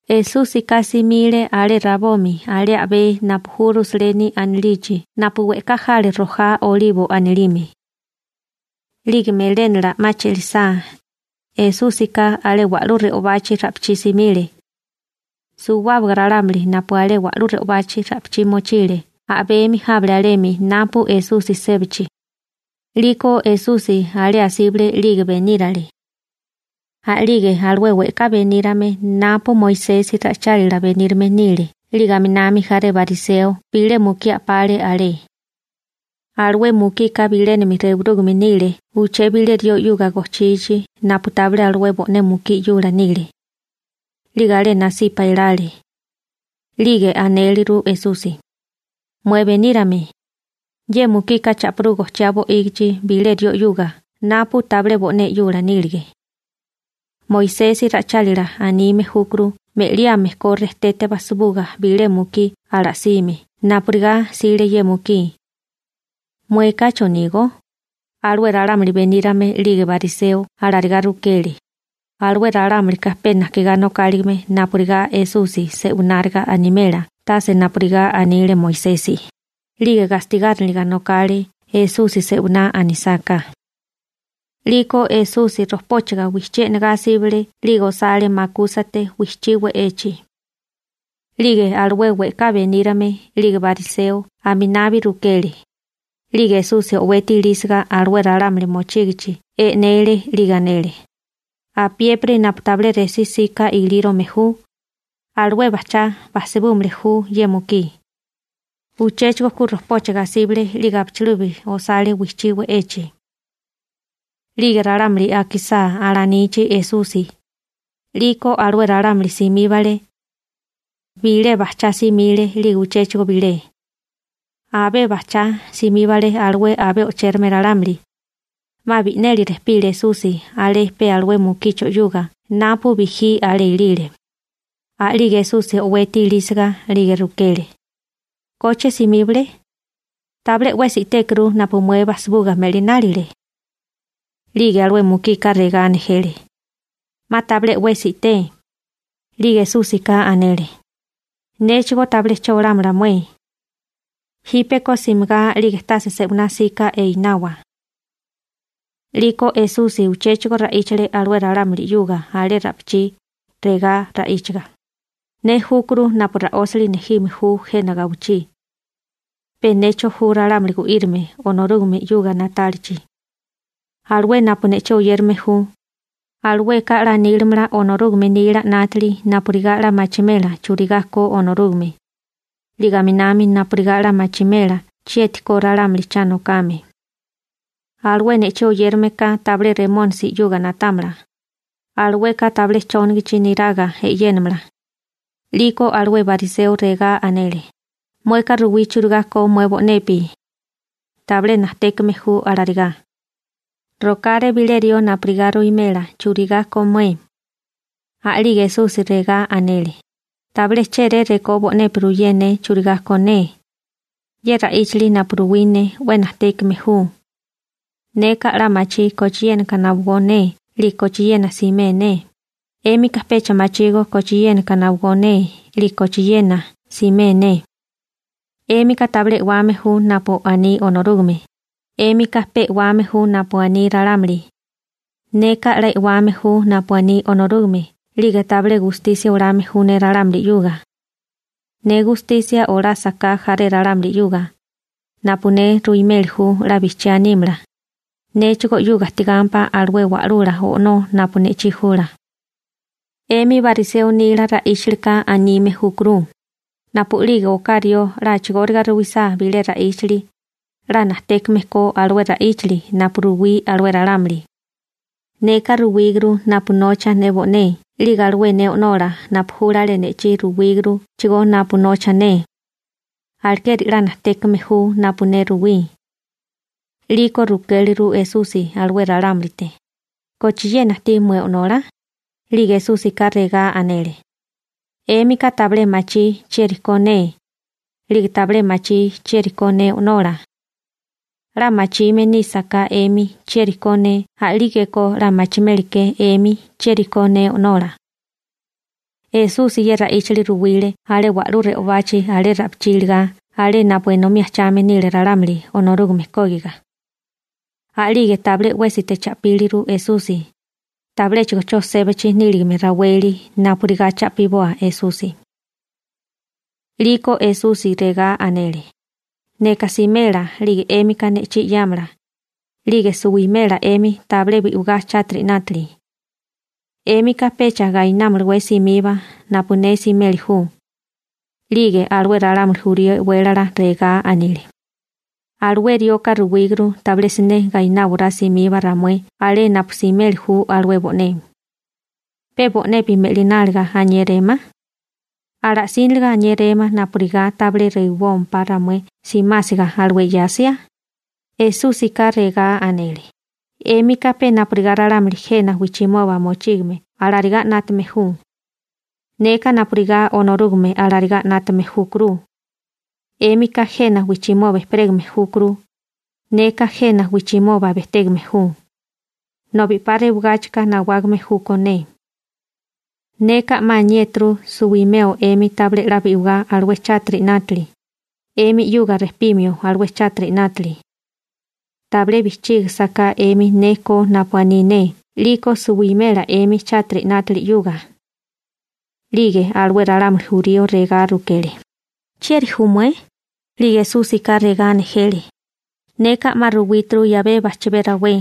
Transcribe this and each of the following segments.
Esúsika simile alé rabomi alé a'bé napu ju Rusaleni anilichi napu we'ká jale rojá Olibo anilime. 'Lige melénala 'ma che'lisá, Esúsika alé wa'lú re'obachi ra'pichí simile. Suwábaga ralámuli napu alé wa'lú re'obachi ra'pichí mochile a'bemi jábale alemi napu Esusi sébachi, 'liko Esusi alé asíbale 'lige benírale. A'lige alué we'ká benírame napu Moisesi ra'ichálila benírame nile 'lige aminami jaré bariseo bilé mukí a'pale alé. Alué mukika bilénami rewirúgame nile uché bilé rió 'yuga gojchichi napu tabilé alué bo'né mukí 'yula nile. 'Lige alé nasipa elale. 'Lige anéliru Esusi: ―Mué benírame, ye mukika cha'pirú gojchiá bo'ígichi bilé rió 'yuga napu tabilé bo'né 'yula nílige. Moisesi ra'ichálila anime júturu me'liame ko rejtete basibuga bilé mukí ala'sime napurigá 'sile ye mukí. ¿Mueka chonígó? Alué ralámuli benírame 'lige bariseo alarigá rukele. Alué ralámulika pe najkigá nokáligime napurigá Esusi se'wináriga animela tase napurigá anile Moisesi, 'lige gastigáriniliga nokale Esusi se'winá anisáká. 'Liko Esusi rojpóchiga wijchí e'nagá asíbale 'lige osale makúsate wijchí we'echi. 'Lige alué we'ká benírame 'lige bariseo aminabi rukele, 'lige Esusi o'weti ilísiga alué ralámuli mochígichi e'nele 'lige anele: ―Apiépiri napu tabilé resí 'sika ilírome ju, alué bajchá basibúmili ju ye mukí. Uchéchigo ku rojpóchiga asíbale 'lige abichilubi osale wijchí we'echi. 'Lige ralámuli akisá alanichi Esusi, 'liko alué ralámuli simíbale. Bilé bajchá simile 'lige uchéchigo bilé. Abé bajchá simíbale alué abé o'chérame ralámuli. 'Ma bi'neli rejpile Esusi alé pe alué mukicho 'yuga napu bijí alé ilile. A'lige Esusi o'weti ilísiga, 'lige rukele: ―¿Koche simíbale? Tabilé 'wesi i'tékuru napu mué bajsibuga me'linálile. 'Lige alué mukika regá nejele: ―'Ma tabilé 'wesi i'té. 'Lige Esúsika anele: ―Néchigó tabilé che olámala mué. Jípeko simigá 'lige tase se'winá 'sika einawa. 'Liko Esusi uchéchigo ra'íchale alué ralámuli 'yuga alé ra'pichí, regá ra'íchiga: ―Ne júkuru napu ra'ósili nejime ju jena gawichí. Pe necho ju ralámuli gu'írime Onorúgame 'yuga na'tálichi. Alué napu ne'chí oyérame ju, alueka 'la nílimala Onorúgame nila 'nátili napurigá 'la machimela churigá ko Onorúgame, 'lige aminami napurigá 'la machimela chieti ko ralámuli cha nokame. Alué ne'chí oyérame ka tabilé Remónisi 'yuga na'támala. Alueka tabilé chónagachi niraga e'yénamala. 'Liko alué bariseo regá anele: ―Mueka ruwí churigá ko mué bo'nepi. Tabilé najtékame ju alarigá. Rokáré bilé rió napurigá ruwimela churigá ko mué. A'lige Esusi regá anele: ―Tabilé chéré rekó bo'nepi ruyé ne churigá ko ne. Ye ra'íchali napu ruwí ne 'we najtékame ju. Neka 'la machí kochiénaka nawagó ne 'lige kochiena simea ne, 'émika pecha machígó kochiénaka nawagó ne 'lige kochiena simea ne. 'Émika tabilé e'wame ju napu aní Onorúgame, 'émika pe e'wame ju napu aní ralámuli. Neka 'la e'wame ju napu aní Onorúgame 'lige tabilé gustisia olame ju ne ralámuli. Ne gustisia olásaká jaré ralámuli, 'lige napu ne ruimeli ju 'la bijchiá nímala, néchigó 'yuga ajtigámpá alué Wa'lula O'nó napu ne'chí jula. 'Emi bariseo nila ra'íchalika anime júkuru: napu'lige oká rió 'la a'chigóriga ruwisá bilé ra'íchali, 'la najtékame ko alué ra'íchali napu ruwí alué ralámuli. Neka ruwíguru napu nocha ne bo'né 'lige alué ne O'nola napu júlale ne'chí ruwíguruchigó napu nocha ne. Alekeri 'la najtékame ju napu ne ruwí. 'Liko rukéliru Esusi alué ralámulite: ―¿Kochiena ajtí mué o'nola? 'Lige Esúsika regá anele: ―'Émika tabilé machí chieri ko ne, 'lige tabilé machí chieri ko ne O'nola. 'La machime nísaká 'emi chieri ko ne a'lígeko 'la machimeli ke 'emi chieri ko ne O'nola. Esusi ye ra'íchali ruwile alé wa'lú re'obachi alé ra'pichí iligá alé napu enomí ajchame nile ralámuli Onorúgame kógiga. A'lige tabilé 'wésite cha'píliru Esusi, tabiléchigo 'cho sébachi níligame raweli napurigá cha'piboa Esusi. 'Liko Esusi regá anele: ―Neka simela 'lige 'émika ne'chí 'yáamala, 'lige suwimela 'emi tabilé bi'wigá chátiri 'nátili. 'Émika pecha gainámalawé simiba napu ne simeli ju. 'Lige alué ralámuli jurío e'wélala regá anile: ―Alué rioka ruwíguru tabilé siné gaináwaráo simiba ramué alé napu simeli ju alué bo'né. ¿Pe bo'nepi me'lináliga aniéréma? ¿Ala'síniliga aniéréma napurigá tabilé rewibómpá ramué simásiga alué 'yasia? Esúsika regá anele: ―'Émika pe napurigá ralámuli jena wijchimoba mochígame alarigá 'nátame ju. Neka napurigá Onorúgame alarigá 'nátame júkuru. 'Émika jena wijchimoba ejperégame júkuru. Neka jena wijchimoba bejtégame ju, nobi 'pa rewagáchika nawágame júkó ne. Neka 'ma 'la aniéturu suwimeo 'emi tabilé 'la bi'wigá alué chátiri 'nátili, 'emi 'yuga rejpimio alué chátiri 'nátili. Tabilé bijchígasaká 'emi ne ko napu aní ne 'liko suwimela 'emi chátiri 'nátili 'yuga. 'Lige alué ralámuli jurío regá rukele: ―¿Chieri ju mué? 'Lige Esúsika regá nejele: ―Neka 'ma ruwíturu 'yabé bajchibé rawé.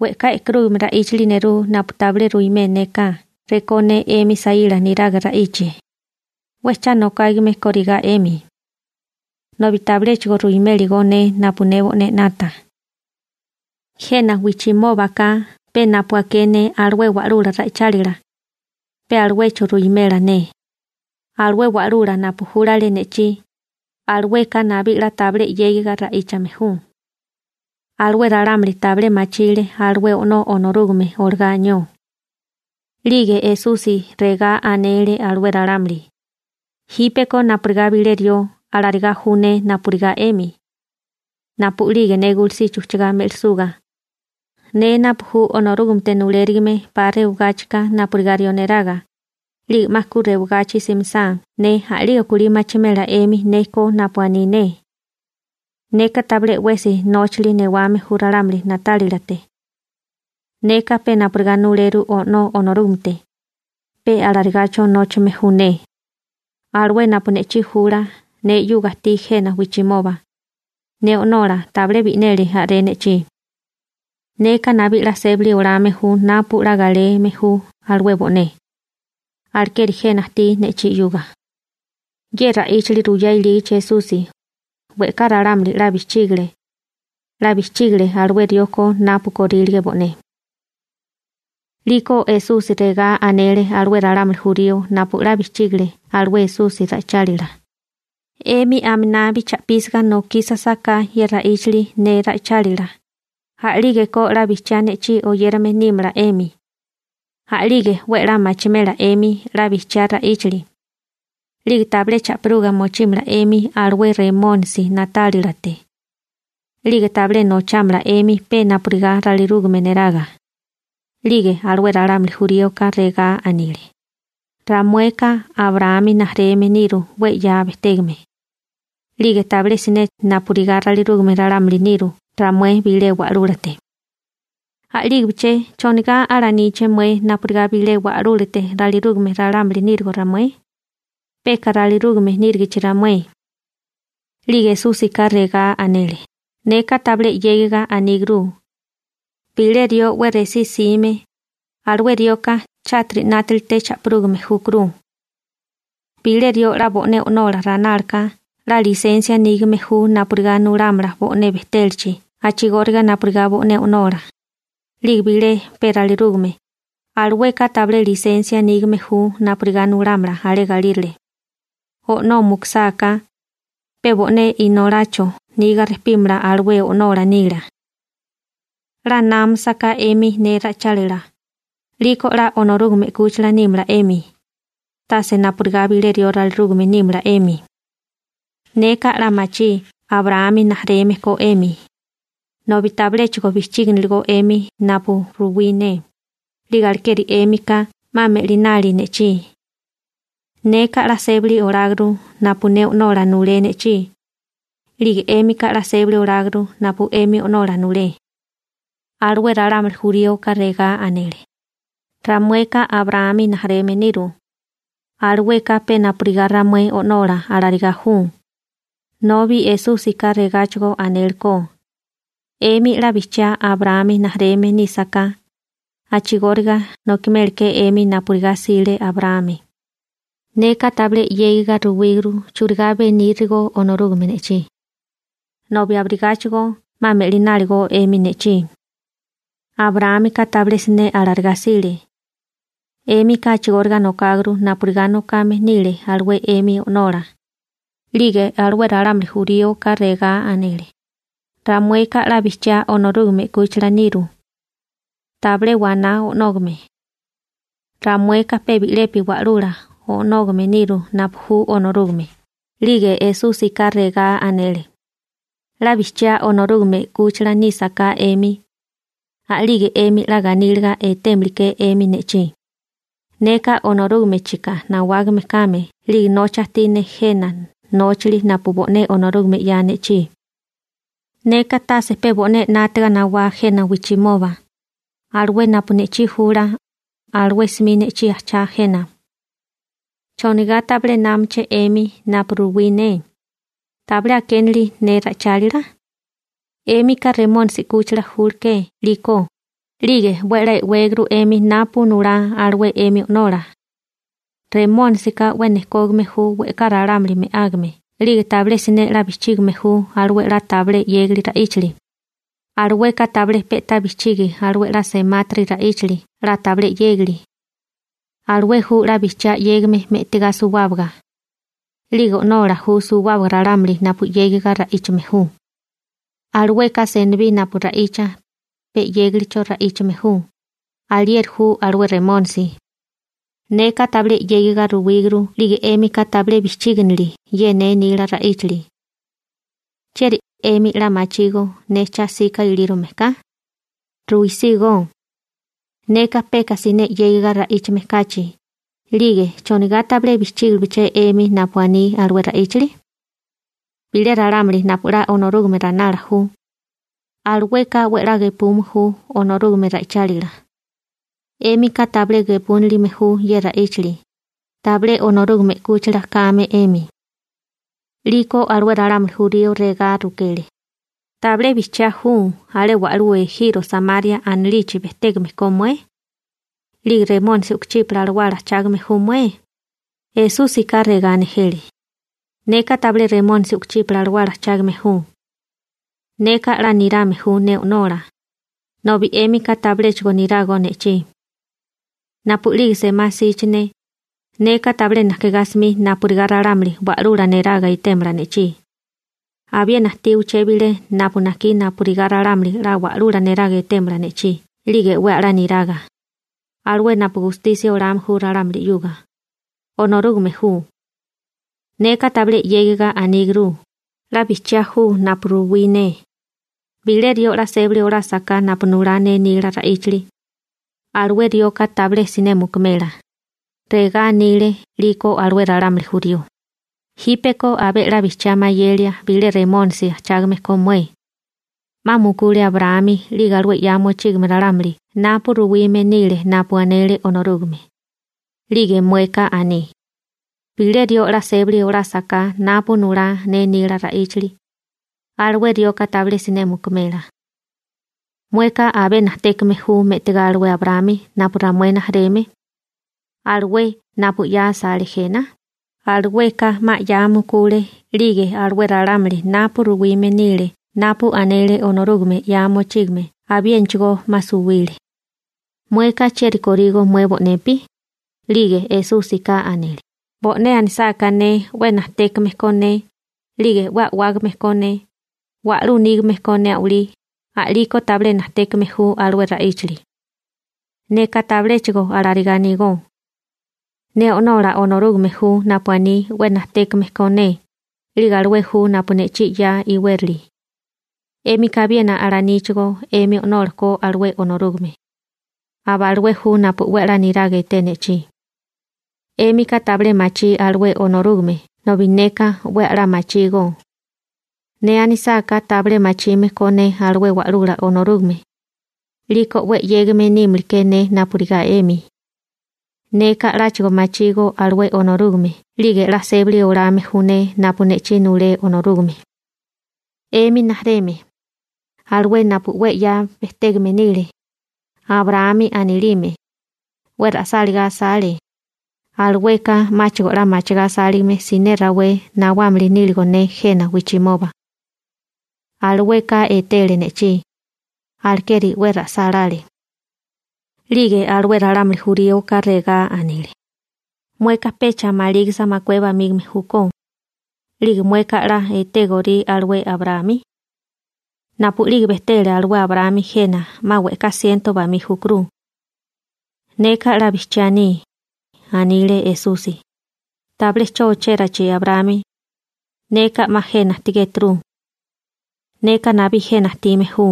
We'ká e'karúgame ra'íchali nerú napu tabilé ruimé néká rekó ne 'emi saíla niraga ra'íchie, 'we cha nokágame kórigá 'emi, nobi tabiléchigo ruiméligó ne napu ne bo'né 'nata. Jena wijchimóbaka pe napu aké ne alué wa'lula ra'ichálila, pe aluecho ruwimela ne. Alué wa'lula napu júlale ne'chí, alueka nabí 'la tabilé 'yégiga ra'íchame ju. Alué ralámuli tabilé machile alué O'nó Onorúgame olagá anió. 'Lige Esusi regá anele alué ralámuli: ―Jípeko napurigá bilé rió, alarigá ju ne napurigá 'emi. Napu'lige ne gulusichi ujchagá me'lisuga, ne napu ju Onorúgamete nulérigime 'pa rewagáchika napurigá rió neraga, 'lige 'ma ku rewagachi simisá ne, a'lige kulí machimela 'emi ne ko napu ne koriání ne bo'né. Neka tabilé 'wesi nóchali newame ju ralámuli na'tálilate. Neka pe napurigá nuleru O'nó Onorúgamete, pe alarigacho nóchame ju ne. Alué napu ne'chí jula, ne 'yuga ajtí jena wijchimoba. Ne O'nola tabilé bi'neli a'ré ne'chí. Neka nabí 'la sébali olame ju napu 'la galeme ju alué bo'né, alekeri jena ajtí ne'chí 'yuga. Ye ra'íchali ruyá ilígichi Esusi, we'ká ralámuli 'la bijchígale. 'La bijchígale alué rió ko napu korílige bo'né. 'Liko Esusi regá anele alué ralámuli jurío napu 'la bijchígile alué Esusi ra'ichálila: ―'Emi aminabi cha'písiga nokísasaká ye ra'íchali ne ra'ichálila, a'lígeko 'la bijchiá ne'chí oyérame nímala 'emi. A'lige 'we 'la machimela 'emi 'la bijchiá ra'íchali. 'Lige tabilé cha'piruga mochímala 'emi alué Remónisi na'tálilate. 'Lige tabilé nochámala 'emi pe napurigá ralirúgame niraga. 'Lige alué ralámuli juríoka regá anile: ―Ramueka Abraámi rijimala niru 'we 'ya bejtégame. 'Lige tabilé siné napurigá ralirúgame ralámuli niru ramué bilé wa'lúlate. A'lígibeché, ¿chonigá alaníché mué napurigá bilé wa'lúlate ralirúgame ralámuli nírigo ramué? Peka ralirúgame nírigichi ramué. 'Lige Esúsika regá anele: ―Neka tabilé 'yégiga aníguru. Bilé rió 'we resí 'sime, alué rioka chátiri 'nátalite cha'pirúgame júkuru. Bilé rió 'la bo'né o'nola ranálaka 'la lisensia nígame ju napurigá nulámala bo'né bejtélachi a'chigóriga napurigá bo'né o'nola, 'lige bilé pe ralirúgame, alueka tabilé lisensia nígame ju napurigá nulámala alé galírale. O'nó mukusáká, pe bo'né inolacho niga rejpímala alué o'nola nila. 'La námasaká 'emi ne ra'ichálila, 'liko 'la Onorúgame 'kúchila nímala 'emi, tase napurigá bilé rió ralirúgame nímala 'emi. Neka 'la machí Abraámi rijimala ko 'emi, nobi tabiléchigo bijchíginiligó 'emi napu ruwí ne, 'lige alekeri 'émika 'ma me'linali ne'chí. Neka 'la sébali oláguru napu ne O'nola nulé ne'chí. 'Lige 'émika 'la sébali oláguru napu 'emi o'nola nulé. Alué ralámuli juríoka regá anele: ―Ramueka Abraámi rijimala niru. Alueka pe napurigá ramué o'nola, alarigá ju. Nobi Esúsika regáchigo anélekó: ―'Emi 'la bijchiá Abraámi rijimala nísaká, a'chigóriga nokimélaké 'emi napurigá 'sile Abraámi. Neka tabilé 'yégiga ruwíguru churigá benírigo Onorúgame ne'chí, nobi abirigáchigo 'ma me'lináligo 'emi ne'chí. Abraámika tabilé siné alarigá 'sile. 'Émika a'chigóriga nokáguru napurigá nokame nile alué 'émi o'nola. 'Lige alué ralámuli juríoka regá anele: ―Ramueka 'la bijchiá Onorúgame 'kúchila niru. Tabilé waná o'nógame. Ramueka pe bi'lepi Wa'lula O'nógame niru napu ju Onorúgame. 'Lige Esúsika regá anele: ―'La bijchiá Onorúgame 'kúchila nísaká 'emi, a'lige 'emi 'la ganíliga etémiliké 'emi ne'chí, neka Onorúgamechika nawágame kame 'lige nocha ajtí ne jena nóchali napu bo'né Onorúgame 'ya ne'chí. Neka tase pe bo'né 'nátaga nawá jena wijchimoba. Alué napu ne'chí jula, alué 'smi ne'chí ajchá jena. ¿Chonigá tabilé námaché 'emi napu ruwí ne? ¿Tabilé akénili ne ra'ichálila? 'Émika Remónisi 'kúchila júleké 'liko, 'lige 'we a'lá e'wéguru 'emi napu nulá alué 'emi o'nola. Remónisika 'we nejkógame ju we'ká ralámuli me'ágame 'lige tabilé siné 'la bijchígame ju alué 'la tabilé 'yégali ra'íchali. Alueka tabilé pe'tá bijchigi alué 'la semátiri ra'íchali 'la tabilé 'yégali. Alué ju 'la bijchiá 'yégame me'tigá suwábaga, 'lige o'nola ju suwábaga ralámuli napu 'yégiga ra'íchame ju. Alueka senibí napu ra'icha, pe 'yégalicho ra'íchame ju. Alieri ju alué Remónisi. Neka tabilé 'yégiga ruwíguru 'lige 'émika tabilé bijchíginili ye ne nila ra'íchali. ¿Chieri 'emi 'la machígó ne cha 'sika ilírome ka? Ruisígó. Neka peka siné 'yégiga ra'íchame kachi, 'lige ¿chonigá tabilé bijchígibeché 'emi napu aní alué ra'íchali? Bilé ralámuli napu 'la Onorúgame ranala ju, alueka 'we a'lá gepume ju Onorúgame ra'ichálila. 'Émika tabilé gepúnilime ju ye ra'íchali, tabilé Onorúgame 'kúchila kame 'emi. 'Liko alué ralámuli jurío regá rukele: ―¿Tabilé bijchiá ju alé wa'lú ejiro Samaria anilichi bejtégame ko mué? 'Lige ¿remónisi u'kuchípala alawala ajchágame ju mué? Esúsika regá nejele: ―Neka tabilé remónisi u'kuchípala alawala ajchágame ju. Neka 'la nirame ju ne O'nola, nobi 'émika tabiléchigo nirágó ne'chí. Napu'lige semá 'sichi ne, neka tabilé najkigá 'smi napurigá ralámuli wa'lula neraga etémala ne'chí. Abiena ajtí uché bilé napu najkí napurigá ralámuli 'la wa'lula neraga etémala ne'chí 'lige 'we a'lá niraga. Alué napu gustisia olame ju ralámuli, alueka Onorúgame ju. Neka tabilé 'yégiga aníguru, 'la bijchiá ju napu ruwí ne. Bilé rió 'la sébali olásaká napu nulá ne nila ra'íchali, alué rioka tabilé siné mukumela. Regá anile 'liko alué ralámuli jurío: ―Jípeko abé 'la bijchiá mayelia bilé remónisi ajchágame ko mué. 'Ma mukule Abraámi 'lige alué 'ya mochígame ralámuli napu ruwime nile napu anele Onorúgame, 'lige mueka aní: «Bilé rió 'la sébali olásaká napu nulá ne nila ra'íchali, alué rioka tabilé siné mukumela.» ¿Mueka abé najtékame ju me'tigá alué Abraámi napu ramué rijimala ju, alué napu 'ya asale jena? Alueka 'ma 'ya mukule 'lige alué ralámuli napu ruwime nile napu anele Onorúgame 'ya mochígame abiénachigó 'ma suwile. ¿Mueka chieri korígó mué bo'nepi? 'Lige Esúsika anele: ―Bo'né anisáká ne 'we najtékame ko ne, 'lige 'we a'wágame ko ne, wa'lú nígame ko ne a'walí, a'liko tabilé najtékame ju alué ra'íchali. Neka tabiléchigo alarigá anígó. Ne O'nola Onorúgame ju napu aní 'we najtékame ko ne, 'lige alué ju napu ne'chí 'ya iwérali. 'Émika abiena alaníchigó 'emi O'nola ko alué Onorúgame. Aba alué ju napu 'we a'lá niraga eté ne'chí. 'Émika tabilé machí alué Onorúgame nobi neka 'we a'lá machígó. Ne anisáká tabilé machime ko ne alué Wa'lula Onorúgame, 'liko 'we 'yégame nímili ke ne napurigá 'emi. Neka 'láchigo machígó alué Onorúgame 'lige 'la sébali olame ju ne napu ne'chí nulé Onorúgame. 'Emi rijimala, alué napu 'we 'ya bejtégame nile, Abraámi anilime, 'we ra'sáligá asale, alueka 'máchigo 'la machigá asáligame siné rawé nawámili níligo ne jena wijchimoba. Alueka etele ne'chí, alekeri 'we ra'sálále. 'Lige alué ralámuli juríoka regá anile: ―Mueka pecha malígisa makué bamígame júkó, 'lige mueka 'la etégorí alué Abraámi. Napu'lige bejtele alué Abraámi jena 'ma we'ká siento bamí júkuru. ―Neka 'la bijchiá aní ―anile Esusi― tabilé 'cho ochérachi Abraámi, neka 'ma jena ajtigéturu. Neka nabí jena ajtime ju.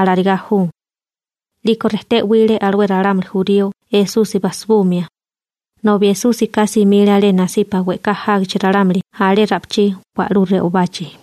Alarigá ju. 'Liko rejté 'wile alué ralámuli jurío Esusi basibumia, nobi Esúsika simile alé nasipa we'ká jágichi ralámuli alé ra'pichí wa'lú re'obachi.